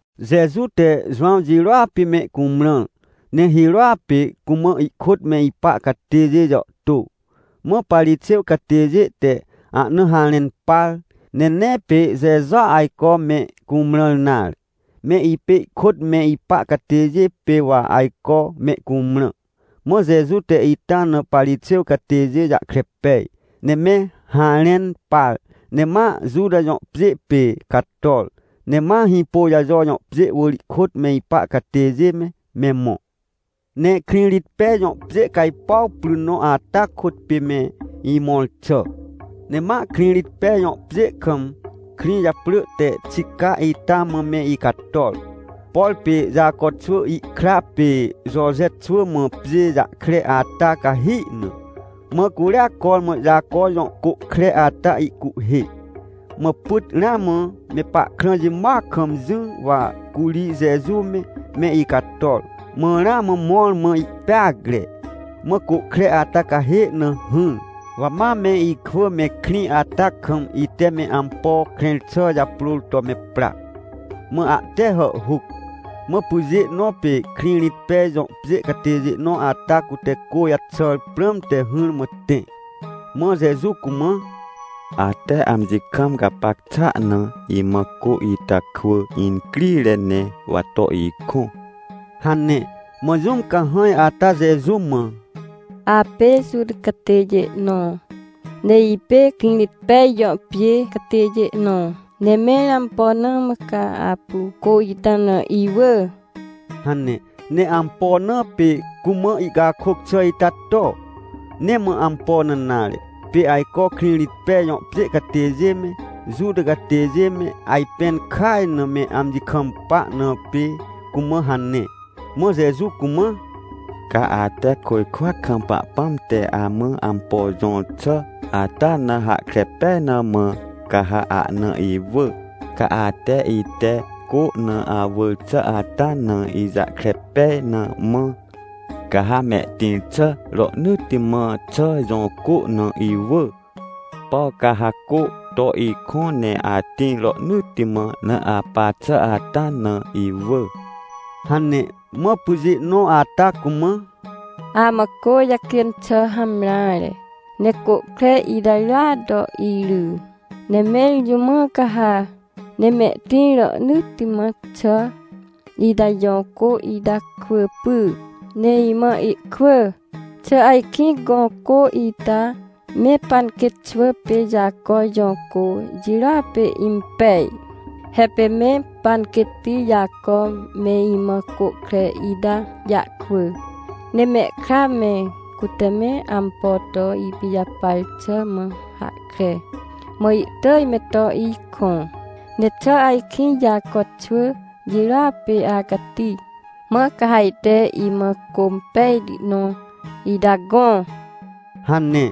Jeju te Jowãw jirôa pê mecumrãr, ne hirôa pê cumã ihkôt me ipa catêjê jàhtô. Mã Parixêw catêjê te ahna harẽn par. Ne nee pê Jejua ajco me cumrãr nare, me ipê ihkôt me ipa catêjê pê wa ajco me cumrã. Mã Jeju te ita na Parixêw catêjê jahkre pej, ne me harẽn par, ne ma Juta jõ pjê pê cator, ne ma Hĩpôjajo jõ pjê wỳr ihkôt me ipa catêjê me, me mõ. Ne Krĩrĩtpej jõ pjê cajpuaw pry nõ ata kôt pê me imõr xà. Ne ma Krĩrĩtpej jõ pjê kam krĩ japrỳ te Xica ita mã me icator, por pê Jaco xwỳ ihkra pê Joje xwỳ mã pjê jahkre ata cahi na. Mã curia cormã Jaco jõ côhkre ata ihcuhhê. Mã pyt ramã me pahkrã jimoac kam jỹ, wa curi Jeju me, me icator, mã ramã mõr mã ihpeacre, mã côhkre ata cahê na hỹr. Wa ma me ikwỳ me krĩ ata kam ite me ampo krẽr xà japrôr to me pra, mã ahte hàhhuc. Mã pyjê nõ pê Krĩrĩtpej jõ pjê catêjê nõ ata, cute cô jaxàr prãmte hỹrmã tẽ, mã Jeju cumã: — Ate amji kam gapac xàa na, imã cô ita kwỳ incrire ne, wa to ikõ — hane. Mã jũm cahãj ata Jeju mã: — Apê Juta catêjê nõ, ne ipê Krĩrĩtpej jõ pjê catêjê nõ, ne mẽr ampo na mã ca apu cô ita na iwỳ? — hane. Ne ampo na pê cumã ihcakôc xà ita to? Nee mã ampo na nare, pê ajco Krĩrĩtpej jõ pjê catêjê me, Juta catêjê me ajpẽn kaj na me amji kampa, na pê cumã hane. Mã Jeju cumã: — Ca ate côjkwa kam Pahpãm te amã ampo jõr xà ata na hahkre pej na mã, ca ha ahna iwỳ. Ca ate ite cô na awỳr xà ata na ijahkre pej na mã, ca ha mehtĩr xà rohnỳtti mã xà jõ cô na iwỳ, por ca ha cô to ikõ ne atĩr rohnỳtti mã na apa xà ata na iwỳ — hane. Mã pyjê nõ ata cumã: — Amã cô jacjên xà hamreare, ne côhkre ita rya to iry. Ne mẽr jũ mã ca ha, ne mehtĩr rohnỳtti mã xà ita jõ cô ita kwỳ py, ne imã ihkwỳ? Xà ajkĩ gõ cô ita me panquêt xwỳ pê Jaco jõ cô jirôa pê impej? He pê me panquêtti Jaco me imã côhkre ita jahkwỳ, ne mehkra me, cute me ampo to ipijapar xà mã hahkre, mã ihtỳj me to ikõ. Ne xà ajkĩ Jaco xwỳ jirôa pê acati, mã ca ha ajte imã cô impejti nõ ita gõ? — hane.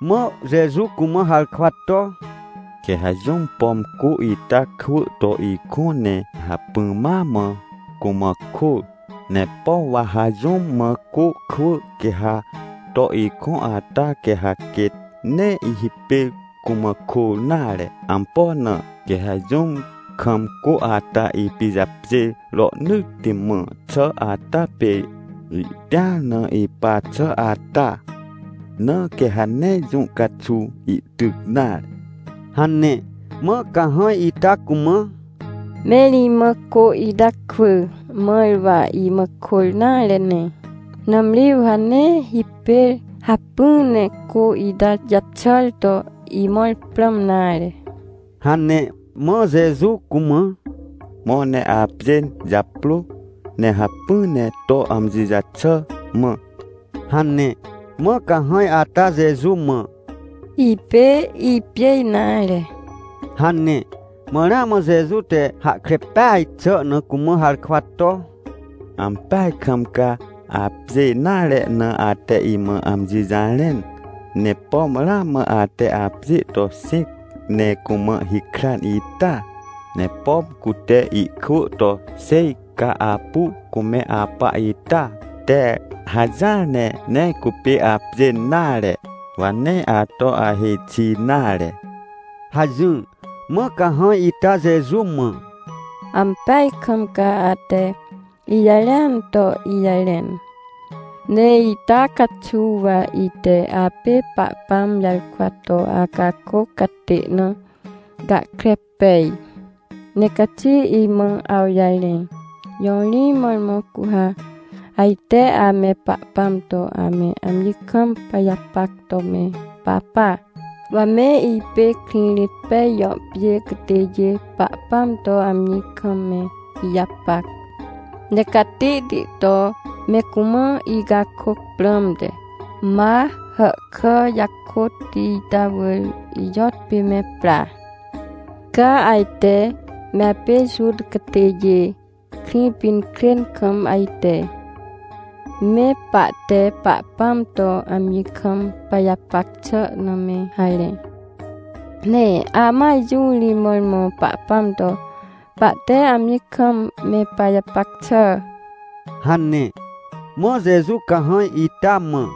Mã Jeju cumã harkwa to: — Quê ha jũm, pom cô ita kwỳ to ikõ, ne hacpỹ ma mã cumã kôr. Ne por wa ha jũm mã cô kwỳ, quê ha to ikõ ata, quê ha quêt nee hipêr cumã kôr nare. Ampo na? Quê ha jũm kam cô ata ipijapjêr rohnỳtti mã xà ata pê ihtĩar na ipa xà ata, na quê ha nee jũ caxuw ihtyc nare — hane. Mã cahãj ita cumã: — Mẽr imã cô ita kwỳ, mãr wa imã kôr nare ne, nãmri wa nee hipêr hacpỹ ne cô ita jaxàr to imõr prãm nare — hane. Mã Jeju cumã: — Mõ ne apjên japrô, ne hacpỹ ne to amji jaxà mã — hane. Mã cahãj ata Jeju mã: — Ipê ipjê nare — hane. Mã ramã Jeju te hahkre peaj xà na cumã harkwa to: — Ampeaj kam ca apjê nare na ate imã amji jarẽn. Ne pom ramã ate apjê to xĩc, ne cumã hikran ita. Ne pom cute ihkwỳ to xêj ca apu cume apa ita te hajỹar, ne nee cupê apjên nare. Wa nee ato ahêj xi nare — hajỹr. Mã cahãj ita Jeju mã: — Ampeaj kam ca ate ijarẽan to ijarẽn. Ne ita caxuw wa ite apê Pahpãm jarkwa to acakôc catê na gahkre pej. Ne caxi imã awjarẽ. Jõ ri mõrmõ cu ha ajte ame Pahpãm to ame amji kam pajapac to me papa? Wa me ipê Krĩrĩtpej jõ pjê catêjê Pahpãm to amji kam me ijapac, ne catihti to me cumã icakôc prãmte, ma hàhkà jakôtti ita wỳr ijõtpê me pra. Ca ajte me apê Juta catêjê Krĩpinkrên kam ajte, me pahte Pahpãm to amji kam pajapac xà na me harẽ. Ne amãa, jũ ri mõrmõ Pahpãm to pahte amji kam me pajapac xà? — hane. Mã Jeju cahãj ita mã: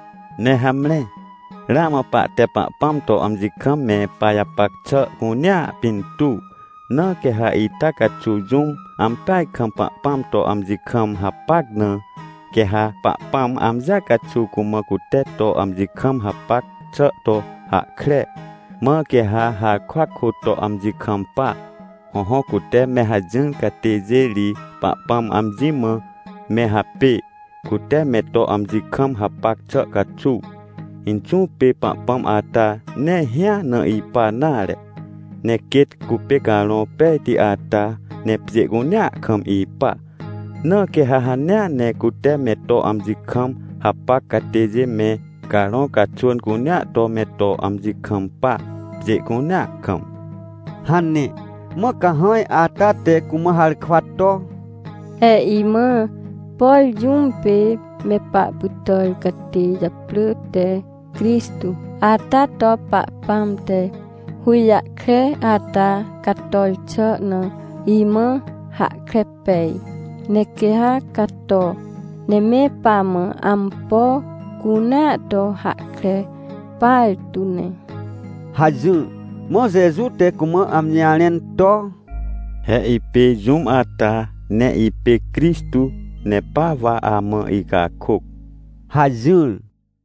Ne hamre, ramã pahte Pahpãm to amji kam me pajapac xà cunea pintuw. Na quê ha ita caxuw jũm ampeaj kam Pahpãm to amji kam hapac na, quê ha Pahpãam amji caxuw cumã cute to amji kam hapac xà to hahkre, mãr quê ha harkwa kôt to amji kampa. Hõhõ, cute me hajỹr catêjê ri Pahpãm amji mã me hapê, cute me to amji kam hapac xà caxuw. Inxũ pê Pahpãm ata nee hĩa na ipa nare, ne quêt cupê Carõ Pejti ata, ne pjê cunea kam ipa. Na quê ha hanea ne cute me to amji kam hapac catêjê me carõ caxwỳn cunea to me to amji kampa, pjê cunea kam — hane. Mã cahãj ata te cumã harkwa to: — He imã, por jũm pê me pahpytàr catê japrỳ te Crixtô ata to Pahpãm te hũjahkre ata cator xà na imã hahkre pej. Ne quê ha cato, ne me pamã ampo cunea to hahkre partu ne — hajỹr. Mã Jeju te cumã amji jarẽn to: — He ipê jũm ata, ne ipê Crixtô, ne pa wa amã icakôc — hajỹr.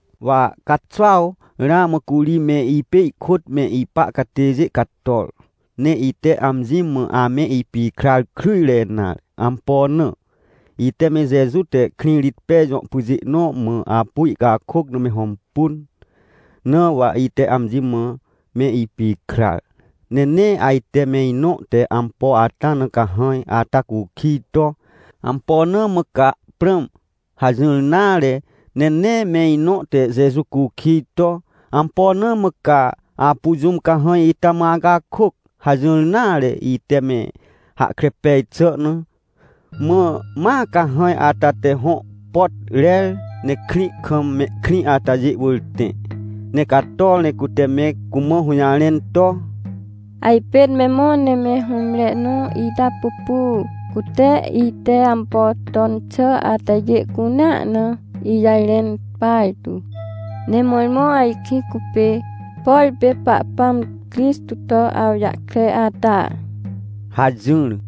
Wa caxuaw ramã curi me ipê ihkôt me ipa catêjê cator, ne ite amji mã ame ipikrar kryjre nare. Ampo na? Ite me Jeju te Krĩrĩtpej jõ pyjê nõ mã apu ihcakôc na me hõmpun, na wa ite amji mã me ipikrar. Ne nee ajte me inõ te ampo ata na cahãj ata cukij to: — Ampo na mã ca prãm? — hajỹr nare. Ne nee me inõ te Jeju cukij to: — Ampo na mã ca apu jũm cahãj ita mã acakôc? — hajỹr nare, ite me hahkre pej xà na. Mã ma cahãj ata te hõ pot rer, ne krĩ kam mehkrĩ atajê wỳr tẽ, ne cator ne cute me cumã hũjarẽn to: — Ajpên me mõ ne me hũmre nõ ita pupu, cute ite ampo ton xà atajê cunea na ijarẽn partu. Ne mõrmõ ajkĩ cupê, por pê Pahpãm Crixtô to awjahkre ata? — hajỹr.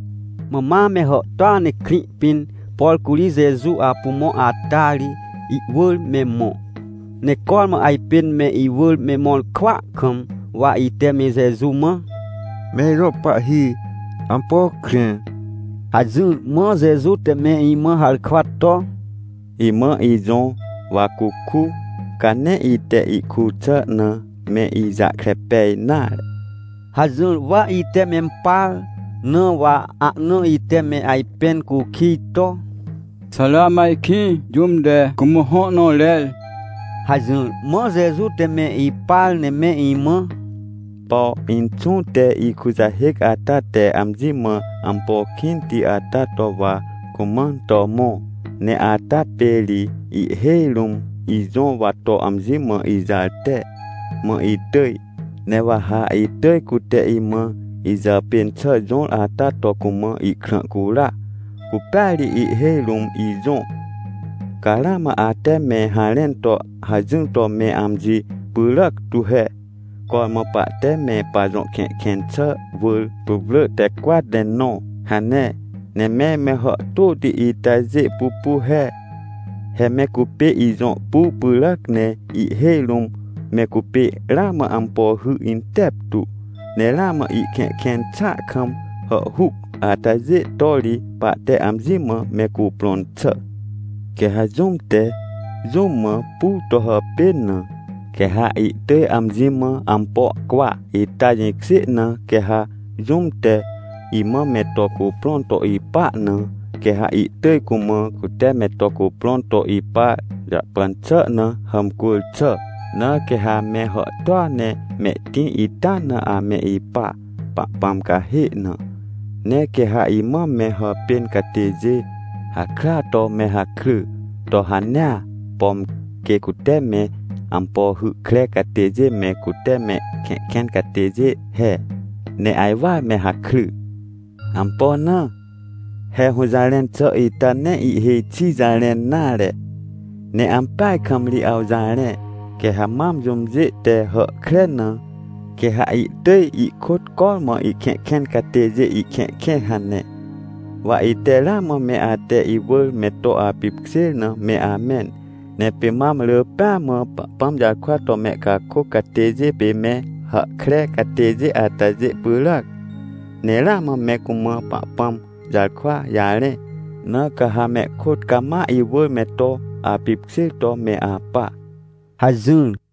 Mã ma me hàhtôa ne krĩ pĩn, por curi Jeju apu mõ ata ri, ihwỳr me mõ. Ne cormã ajpên me iwỳr me mõr kwỳa kam, wa ite me Jeju mã: — Me ijõ Pahhi, ampo krẽ! — hajỹr. Mã Jeju te me imã harkwa to: — Imã ijõ, wa cuku, ca nee ite ihkur xà na me ijahkre pej nare — hajỹr. Wa ite mempar, na wa ahna ite me ajpẽn cukij to: — Xà ramã ajkĩ jũm te cumã hõ nõ rer? — hajỹr. Mã Jeju te me ipar ne me imã: — Por Inxũ te ikujahêc ata te amji mã ampo kĩnti ata to wa cumãn to mõ, ne ata pê ri ihhêj rũm ijõ, wa to amji mã ijarte, mã itỳj. Ne wa ha itỳj cute imã ijàpên xà jõr ata to cumã ihkrã cura, cupêa ri ihhêj rũm ijõ. — Ca ramã ate me harẽn to hajỹr to me amji pyràc tu he: “Cormã pahte me pajõ kẽhkẽn xà wỳr putwrỳ te cwat ne nõ” hane. Ne mẽr me hàhtôti itajê pupu he. He me cupê ijõ pur pyràac. Ne ihhêj rũm me cupê ramã ampo hy inteptu, ne ramã ihkẽhkẽn xàa kam hàhhuc atajê to ri pahte amji mã me cuprõn xà. Quê ha jũm te, jũm mã pur to hàpên na, quê ha ihtỳj amji mã ampo cwa. Ita jĩkjê na, quê ha jũm te imã me to cuprõn to ipa na, quê ha ihtỳj, cumã cute me to cuprõn to ipa jahpan xà na, hàmcwỳr xà. Na quê hame hàhtôa ne mehtĩr ita na ame ipa, Pahpãm cahê na. Ne quê ha imã me hàpên catêjê hakrya to me hakry to hanea, pom quê cute me ampo hy kre catêjê me, cute mehkẽhkẽn catêjê he, ne ajwar me hakry. Ampo na? He hũjarẽn xà ita nee ihhêj xi jarẽn nare, ne ampeaj kam ri awjarẽ: “Quê ha mam jũmjê te hàhkre na, quê ha ihtỳj ihkôt cormã ihkẽhkẽn catêjê ihkẽhkẽ” hane. Wa ite ramã me ate iwỳr me to apipkjêr na me amẽn. Ne pê mam rỳ pêa mã, Pahpãm jarkwa to mehcakôc catêjê pê me hàhkre catêjê atajê pyràac, ne ramã me cumã Pahpãm jarkwa jarẽ. Na ca ha mehkôt cama iwỳr me to apipkjêr to me apa — hajỹr.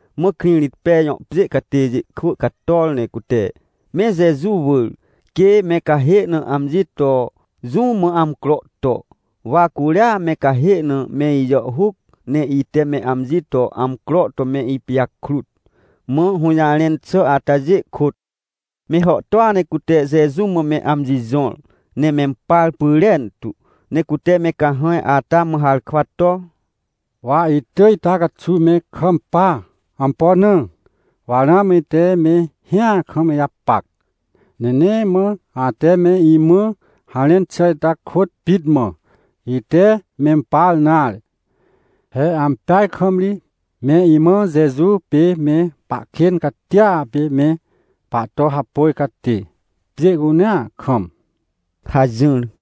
Mã Krĩrĩtpej jõ pjê catêjê kwỳ cator, ne cute me Jeju wỳr, quê me cahê na amji to jũ mã amcro to. Wa curia me cahê na me ijàhhuc, ne ite me amji to amcro to me ipijakrut. Mã hũjarẽn xà atajê kôt, me hàhtôa ne cute Jeju mã me amji jõr, ne mempar pyrentu. Ne cute me cahãj ata mã harkwa to: — Wa itỳj ita caxuw me kampa. Ampo na? Wa ramã ite me hĩa kam ijapac, ne nee mã ate me imã harẽn xà ita kôt pit mã, ite mempar nare. He ampeaj kam ri me imãa Jeju pê me pahkên catia pê me pahto hapôj catê, pjê cunea kam — hajỹr.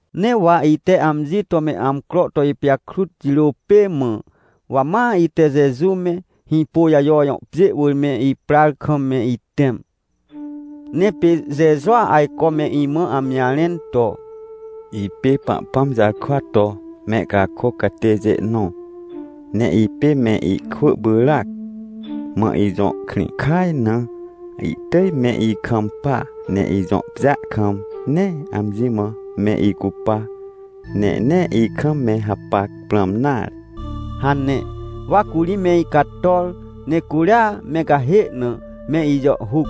Ne wa ite amji to me amcro to ipijakrut jirô pê mã, wa ma ite Jeju me, Hĩpôjajo jõ pjê wỳr me iprar kam me itẽm. Ne pê Jejua ajco me imã amji jarẽn to: — Ipê Pahpãm jarkwa to mehcakôc catêjê nõ. Ne ipê me ikwỳ pyràac, mã ijõ krĩ kaj na ihtỳj me ikampa. Ne ijõ pjêa kam, nee amji mã me icupa, ne nee ikam me hapac prãm nare — hane. Wa curi me icator, ne curia me cahê na me ijàhhuc.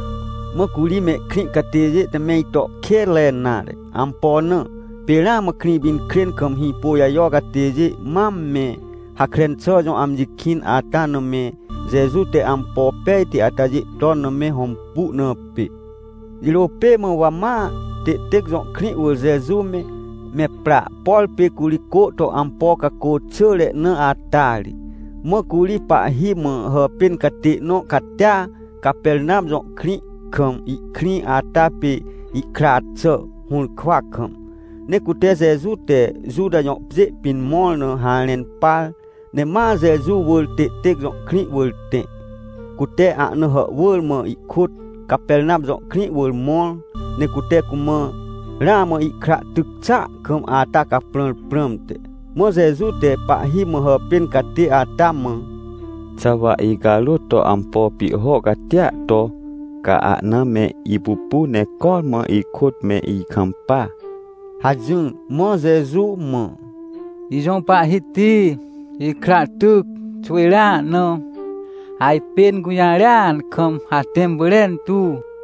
Mã curi mehkrĩ catêjê te meito kênre nare. Ampo na? Pê ramã Krĩpinkrên kam Hĩpôjajo catêjê mam me Hakren xà jõ amji kĩn ata na me Jeju te ampo pejti atajê ton na me hõmpu na pê. Jirô pê mã wa ma Têtêc jõ krĩ wỳr Jeju me, me pra, por pê curi cô to ampo cacô xỳre na ata ri. Mã curi pahhi mã hàpên catê nõ catia, Capernam jõ krĩ kam ihkrĩ ata pê ihkra xà, hũrkwa kam. Ne cute Jeju te Juta jõ pjê pĩn mõr na harẽn par, ne ma Jeju wỳr Têtêc jõ krĩ wỳr tẽ, cute ahna hàhwỳr mã ihkôt Capernam jõ krĩ wỳr mõr. Ne cute cumã ramã ihkra ihtyc xàa kam ata caprãr prãmte. Mã Jeju te pahhi mã hàpên catê ata mã: — Xà wa icarôt to ampo pihho catia to, ca ahna me ipupu ne cormã ihkôt me ikampa? — hajỹr. Mã Jeju mã: — Ijõ Pahhiti, ikra tyc xwỳjrea na, ajpên gũjarêan kam atẽm pyrentu!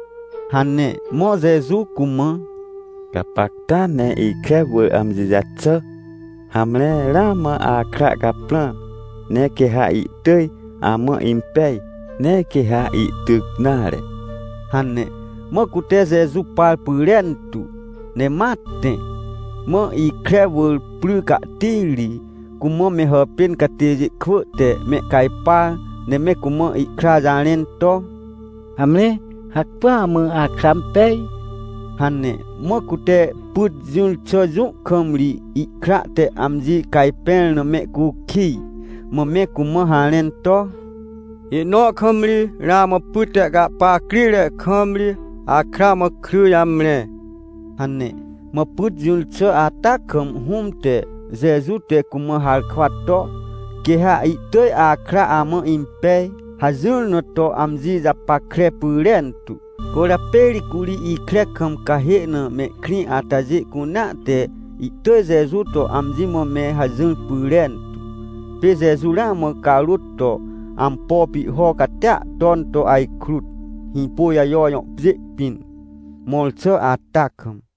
— hane. Mã Jeju cumã: — Gapacta ne ikre wỳr amji jaxà! Hamre, ramã akra caprãr, ne quê ha ihtỳj amã impej, nee quê ha ihtyc nare — hane. Mã cute Jeju par pyrentu, ne ma tẽ. Mã ikre wỳr pry cahtiri cumã me hàpên catêjê kwỳ te mehcajpar, ne me cumã ihkra jarẽn to: — Hamre, hacpỹa mã akra impej — hane. Mã cute pyt jỹr xà jũ kam ri ihkra te amji cajpẽr na, mehcukij. Mã me cumã harẽn to: — Ihnõ kam ri, ramã pyt te ihcahpa crire kam ri, akra mã kry jamre — hane. Mã pyt jỹr xà ata kam hũm te, Jeju te cumã harkwa to: — Quê ha ihtỳj akra amã impej — hajỹr na to amji japackre pyrentu. Cwỳrjapê ri curi ikre kam cahê na mehkrĩ atajê cunea te ihtỳj Jeju to amji mã me hajỹr pyrentu. Pê Jeju ramã carôt to ampo pihho catia ton to ajkrut, Hĩpôjajo jõ pjê pĩn mõr xà ata kam.